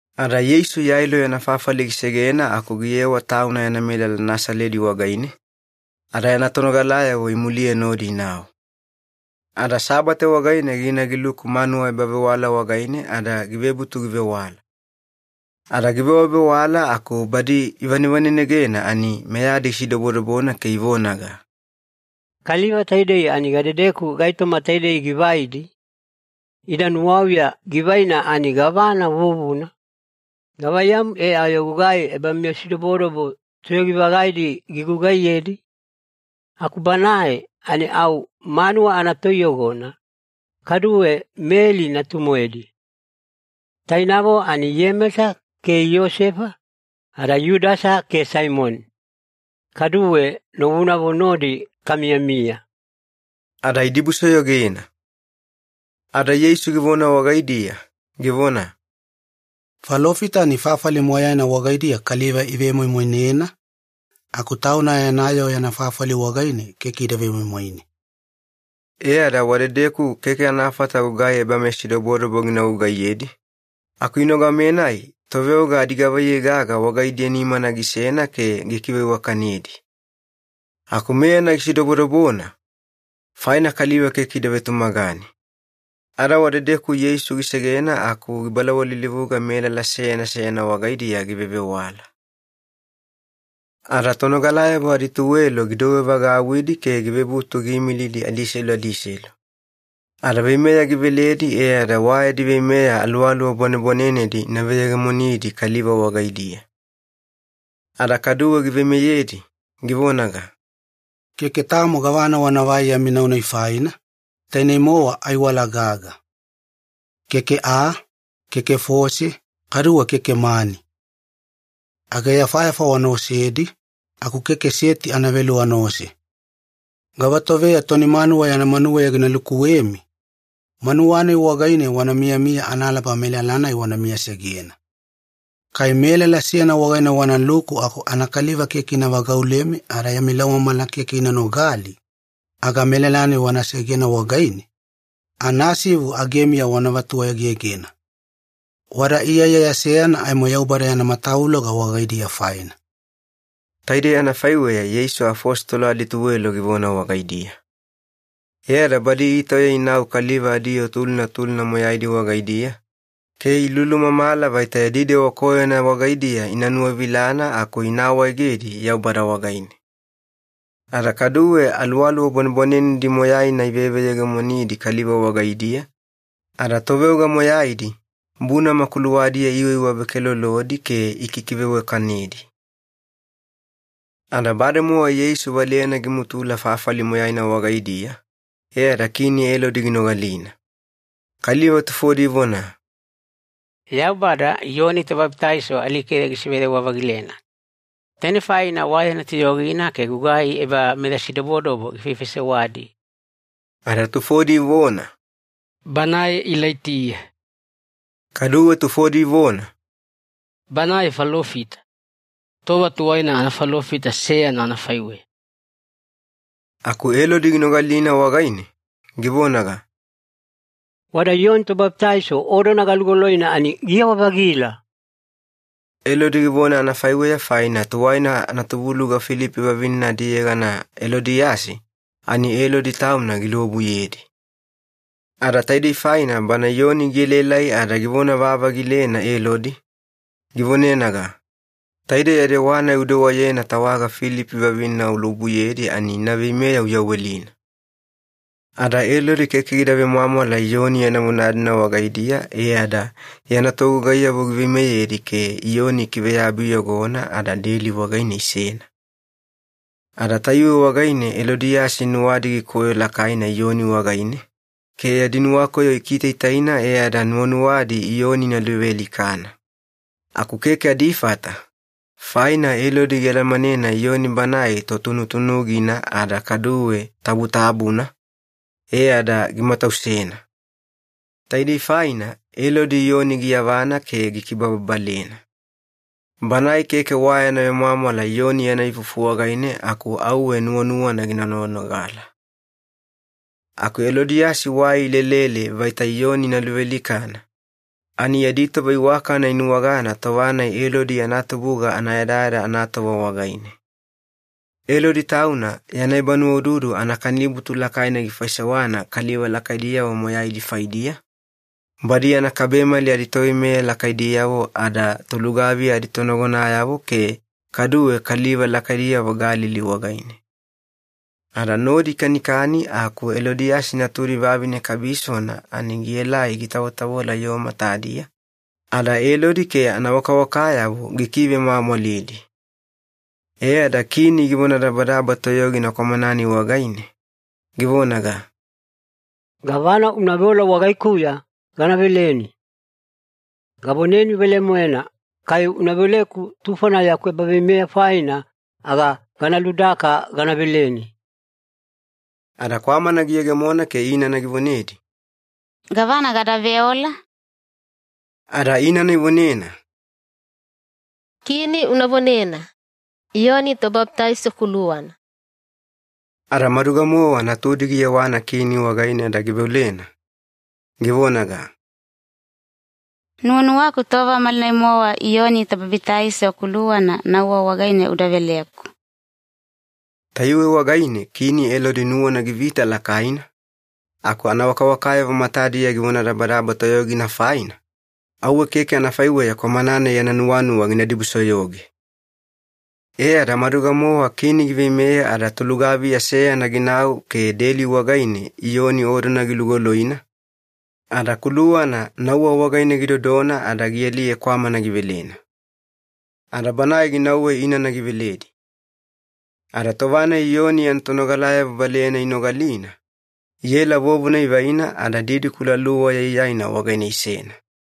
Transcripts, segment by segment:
Ada Yeisu Yailo yana fafali gisegena aku giyewa Tauna yana melala Nasaledi wagaine, ada yana tonogalayavo imuliye nodi inau. Ada Sabate wagaine gina giluku manuwa ebavewala wagaine ada givebutu givewala. Ada givewavewala aku badi ivanevanenegena ani meyadi gisidobodobona ke ivonaga, “Kaliva taidei ani gadedeku gaitoma taidei givaidi? Ida nuwauya givaina ani gavana vuvuna? Gavaiyamu e ayo gugai ebameyasidobodobo toyogi-vagaidi gigugaiyedi? Aku banae ani au manuwa anatoiyogona, kaduwe Meli natu-moedi. Tainavo ani Iyemesa ke Iyosefa, ada Yudasa ke Saimoni. Kaduwe novunavo nodi kamiyamiya.” Ada idibusoyogena. Ada Yeisu givona wagaidiya, givona, “Falofita ani fafali moyaina wagaidiya kaliva ivemoimoinena, aku tauna yana yoo yana fafali wagaine keke ida vemoimoine.” E ada wadedeku keke anafata gugai ebameyasidobodobo gina gugaiyedi, aku inogame-nai toveoga adigavaiyei gaga wagaidiya nimana gisena ke gikiveiwakanedi. Aku meyana gisidobodobona, faina kaliva keke ida vetumagane. Ada wadedeku Yeisu gisegena aku gibalawalilivuga melala seyana seyana wagaidiya givevewala. Ada tonogalayavo adituwelo gidouwevagauwidi ke givebutu giimilidi adiselu adiselu. Ada veimeya giveledi e ada wa yadi veimeya aluwaluwa bwanebwanenedi ina veyegemonidi kaliva wagaidiya. Ada kaduwe giveimeyedi, givonaga, “Keke tamo gavana wanavai yami nau-nai faina, tainei-mowa aiwala gaga. Keke aa, keke fose, kaduwe keke mani. Ageyafayafa wana osedi, aku keke seti anavelu wanaose. Gavatoveya toni manuwa yana manuweya gina lukuwemi, manuwa-nai wagaine wana miyamiya analaba melala-nai wana miyasegena. Kai melala seyana wagaine wanaluku aku anakaliva keke ina vagaulemi ada yami laumamala keke ina nogali, aga melala-nai wana segena wagaine, anasivu agemiya wana vatuegegena. Wada iyaiyaya seyana aimo Yaubada yana matavuloga wagaidiya faina.” Taidei anafaiweya Yeisu afositolo adituwelo givona wagaidiya. E ada badi itauya inau kaliva adiyoo tulina tulina moyaidi wagaidiya, ke ilulumamala vaita yadi dewa koyona wagaidiya ina nuwavilana aku ina awaegedi Yaubada wagaine. Ada kaduwe aluwaluwa bwanebwanenedi moyaina iveveyegemonidi kaliva wagaidiya, ada toveoga moyaidi bunama kuluwadiya iiwaiwavekelolodi ke ikikiveiwakanedi. Ada bademowa Yeisu valeyana gimutula fafali moyaina wagaidiya, e ada Kini Elodi ginogalina. Kaliva tufodi ivona, “Yaubada Iyoni Tobabitaiso alikeya gisiveyawa-vagilena. Tainei faina wa yana toyogina ke gugai ebameyasidobodobo gifaifaisewadi.” Ada tufodi ivona, “Banae Ilaitiya.” Kaduwe tufodi ivona, “Banae falofita, tova tuwaina anafalofita seyana anafaiweya.” Aku Elodi ginogalina wagaine, givonaga, “Wada Iyoni Tobabitaiso odona galugoloina ani giyawa-vagila!” Elodi givona anafaiweya faina tuwaina anatubuluga Filipi vavinena adiyegana Elodiyasi ani Elodi tauna giluobuyedi. Ada taidei faina bana Iyoni gielaelai ada givona-vavagilena Elodi, givonenaga, “Taidei ya dewa-nai udewayena tawaga Filipi vavinena uluobuyedi, ani ina veimeya uyawelina.” Ada Elodi keke gida vemwamwala Iyoni yana vona-dina wagaidiya e ada yana togugaiyavo giveimeyedi ke Iyoni ikiveyabi iyogona ada deli wagaine isena. Ada tayuwe wagaine Elodiyasi nuwadi gikoyo lakaina Iyoni wagaine, ke yadi nuwakoyo ikitaitaina e ada nuwanuwadi Iyoni ina luvealikana. Aku keke adifata, faina Elodi gialamanena Iyoni banae totunutunugina ada kaduwe tabutabuna, e ada gimatausena. Taidei faina Elodi Iyoni giyavana ke gikibababalena. Banae keke wa yana vemwamwala Iyoni yana ifufu wagaine aku auwe nuwanuwana gina noganogala. Aku Elodiyasi wai ilelele vaita Iyoni ina luvealikana, ani yadi tova iwakana inuwagana tova-nai Elodi yana tubuga anayadayada anatova wagaine. Elodi tauna yana ebanuwaududu anakanibutu lakaina gifaisewana kaliva lakaidiyavo moyaidi faidiya, badi yana kabemali aditoveimeya lakaidiyavo ada tolugaviya aditonagonayavo ke kaduwe kaliva lakaidiyavo Galili wagaine. Ada nodi ikanikani aku Elodiyasi natudi vavine kabisona ani gielai gitavotavola yoo matadiya, ada Elodi ke anawakawakayavo gikivemwamwalidi. E ada kini givonadabadaba toyogina kwamana-nai wagaine, givonaga, “Gavana una veola wagaikuya, gana veleni. Gavoneni velemoena, kai una veoleku tufona yaku ebaveimeya faina, aga gana ludaka gana veleni.” Ada kwamana giyegemona ke inana givonedi, “Gavana gada veola?” Ada inana ivonena, “Kini una vonena, ‘Iyoni Tobabitaiso kuluwana.’” Ada maduga-mowa natudi giyewana kini wagaine ada giveolena, givonaga, “Nuwanuwaku tova malinai-mowa Iyoni Tobabitaiso kuluwana nauwa wagaine uda veleku.” Tayuwe wagaine Kini Elodi nuwana givita lakaina, aku anawakawakayavo matadiya givonadabadaba toyogina faina, auwe keke anafaiweya kwamana-nai yana nuwanuwa gina dibusoyoge. E ada maduga-mowa Kini giveimeya ada tolugaviya seyana ginau ke deli wagaine Iyoni odona gilugoloina, ada kuluwana nauwa wagaine gidodona ada gialiye kwamana givelena. Ada banae ginauwe inana giveledi. Ada tova-nai Iyoni yana tonogalayavo valeyana inogalina, iela vovona ivaina ada didikula luwa yaiyaina wagaine isena.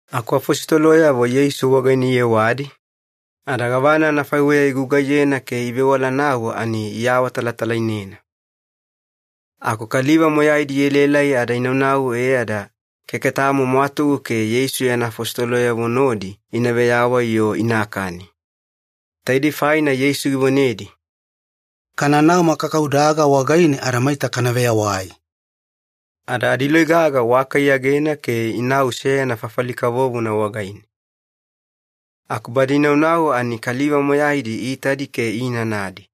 Aku afositoloyavo Yeisu wagaine iyewadi, ada gavana anafaiweya igugaiyena ke ivewalanau ani iawatalatalainena. Aku kaliva moyaidi ielaelai ada inaunau e ada keke tamo mwatugu ke Yeisu yana afositoloyavo nodi ina veyawai-yo inakani. Taidei faina Yeisu givonedi, “Kananau makakaudaga wagaine ada maita kana veyawai.” Ada adiloi gaga waka iyagena ke inau seyana fafali kavovona wagaine. Aku badi inaunau ani kaliva moyaidi iitadi ke iinanadi.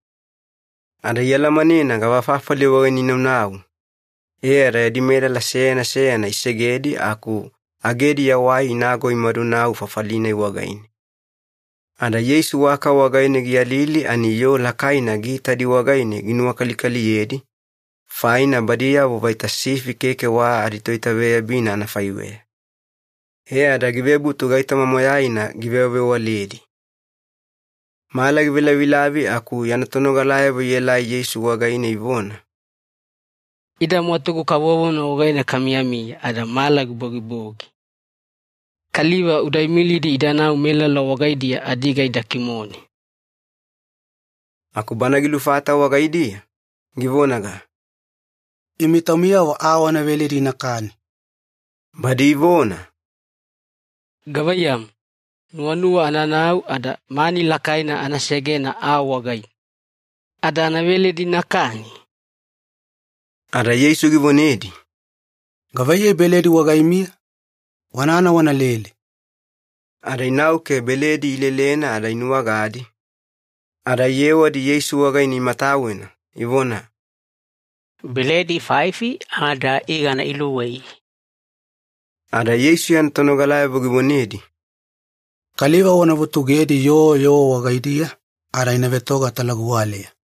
Ada ialamanena gavafafali wagaine inaunau, e ada yadi melala seyana seyana isegedi aku agediya wai inago imadu inau fafali-nai wagaine. Ada Yeisu waka wagaine giyalili ani yoo lakaina giitadi wagaine ginuwakalikaliyedi, faina badiyavo vaita sifi keke wa aditoitaveyabina anafaiweya. E ada givebutu gaitoma moyaina givewavewaledi. Mala givelavilavi aku yana tonogalayavo ielai Yeisu wagaine ivona, “Ida mwatugu kavovona wagaine kamiyamiya ada mala gibogibogi. Kaliva uda imilidi idanau melala wagaidiya adiga ida kimone.” Aku Bana gilufata wagaidiya, givonaga, “Imi taumiyavo aa wana veledi inakani.” Badi ivona, “Gavaiyamu, nuwanuwa ananau ada mani lakaina ana segena aa wagaine, ada ana veledi inakani?” Ada Yeisu givonedi, “Gavaiyei beledi wagaimiya? Wanana wanalele.” Ada inau ke beledi ilelena ada inuwagadi, ada iyewadi Yeisu wagaine imatawena, ivona, “Beledi faifi ada igana iluwei.” Ada Yeisu yana tonogalayavo givonedi, “Kaliva wana vutugedi yoo yoo wagaidiya ada ina vetoga talaguwaleya.”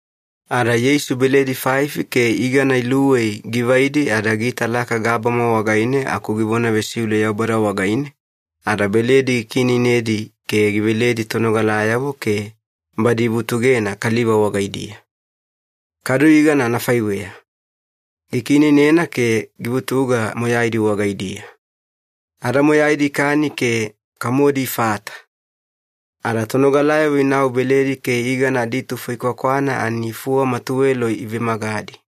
Ada Yeisu beledi faifi ke igana iluwei givaidi ada giitalaka gabama wagaine aku givona vesiule Yaubada wagaine, ada beledi gikiineinedi ke giveledi tonogalayavo ke badi ivutugena kaliva wagaidiya. Kadu igana anafaiweya, gikiineinena ke givutuga moyaidi wagaidiya. Ada moyaidi ikani ke kamodi ifata. Ada tonogalayavo inau beledi ke igana aditufo ikwakwana ani fuwama tuwelo ivemagadi.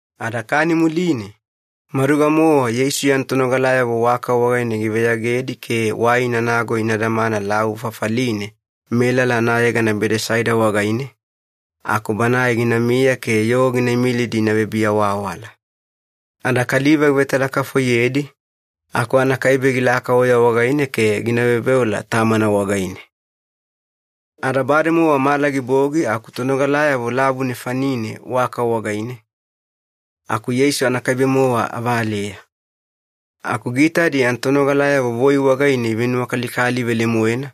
Ada kani muline, maduga-mowa Yeisu yana tonogalayavo waka wagaine giveyagedi ke wai inanago ina damana lavu fafaline melala anayegana Bedesaida wagaine, aku Banae ginamiya ke yoo gina imilidi ina vebiawaawala. Ada kaliva givetalakafoiyedi, aku anakaibe gilaka oya wagaine ke gina veoveola Tamana wagaine. Ada bademowa mala gibogi aku tonogalayavo lavu nefanine waka wagaine, aku Yeisu anakaibe-mowa avaleya. Aku giitadi yana tonogalayavo voi wagaine ivenuwakalikali velemoena,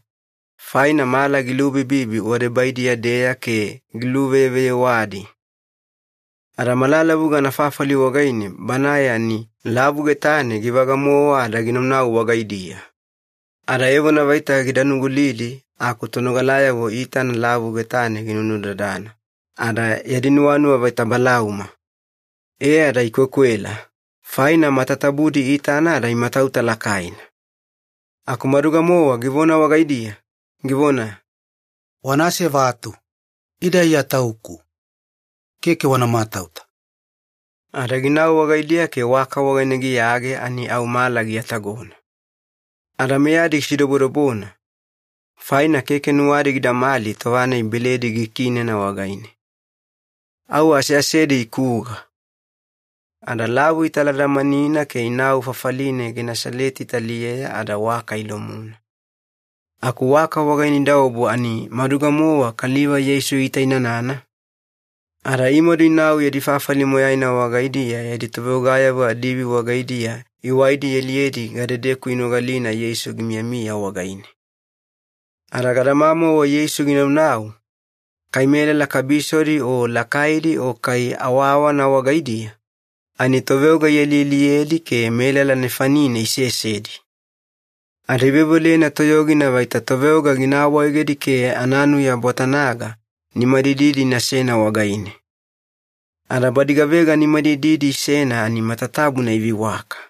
faina mala gilubibibi wadebaidiya-deya ke giluveyeveyewadi. Ada malalavuga anafafali wagaine Banae ani lavu getane givaga-mowa ada ginaunau wagaidiya. Ada evona vaita gida nugulidi aku tonogalayavo iitana lavu getane ginunudadana, ada yadi nuwanuwa vaita balauma. E ada ikwekwela, faina matatabudi iitana ada imatauta lakaina. Aku maduga-mowa givona wagaidiya, givona, “Wana asevatu, ida Iya Tauku. Keke wana matauta.” Ada ginau wagaidiya ke waka wagaine giyage ani au mala giatagona. Ada meyadi gisidobodobona, faina keke nuwadi gidamali tova-nai beledi gikiinena wagaine. Au aseasedi ikuga. Ada lavu italadamanina ke inau fafaline Genesaleti taliyeya ada waka ilomuna. Aku waka wagaine idaobu ani maduga-mowa kaliva Yeisu iitainanana, ada imadu inau yadi fafali moyaina wagaidiya yadi toveogayavo adiivi wagaidiya iwaidi ialiyedi gadedeku inogalina Yeisu gimiyamiya wagaine. Ada gadamamauwe Yeisu ginaunau, kai melala kabisodi o lakaidi o kai awaawana wagaidiya, ani toveoga ialialiyedi ke melala nefanine isesedi. Ada iveoveolena toyogina vaita toveoga gina awaegedi ke ananuya bwatana-ga nimadididi inasena wagaine. Ada badi gavega nimadididi isena ani matatabuna iveiwaka.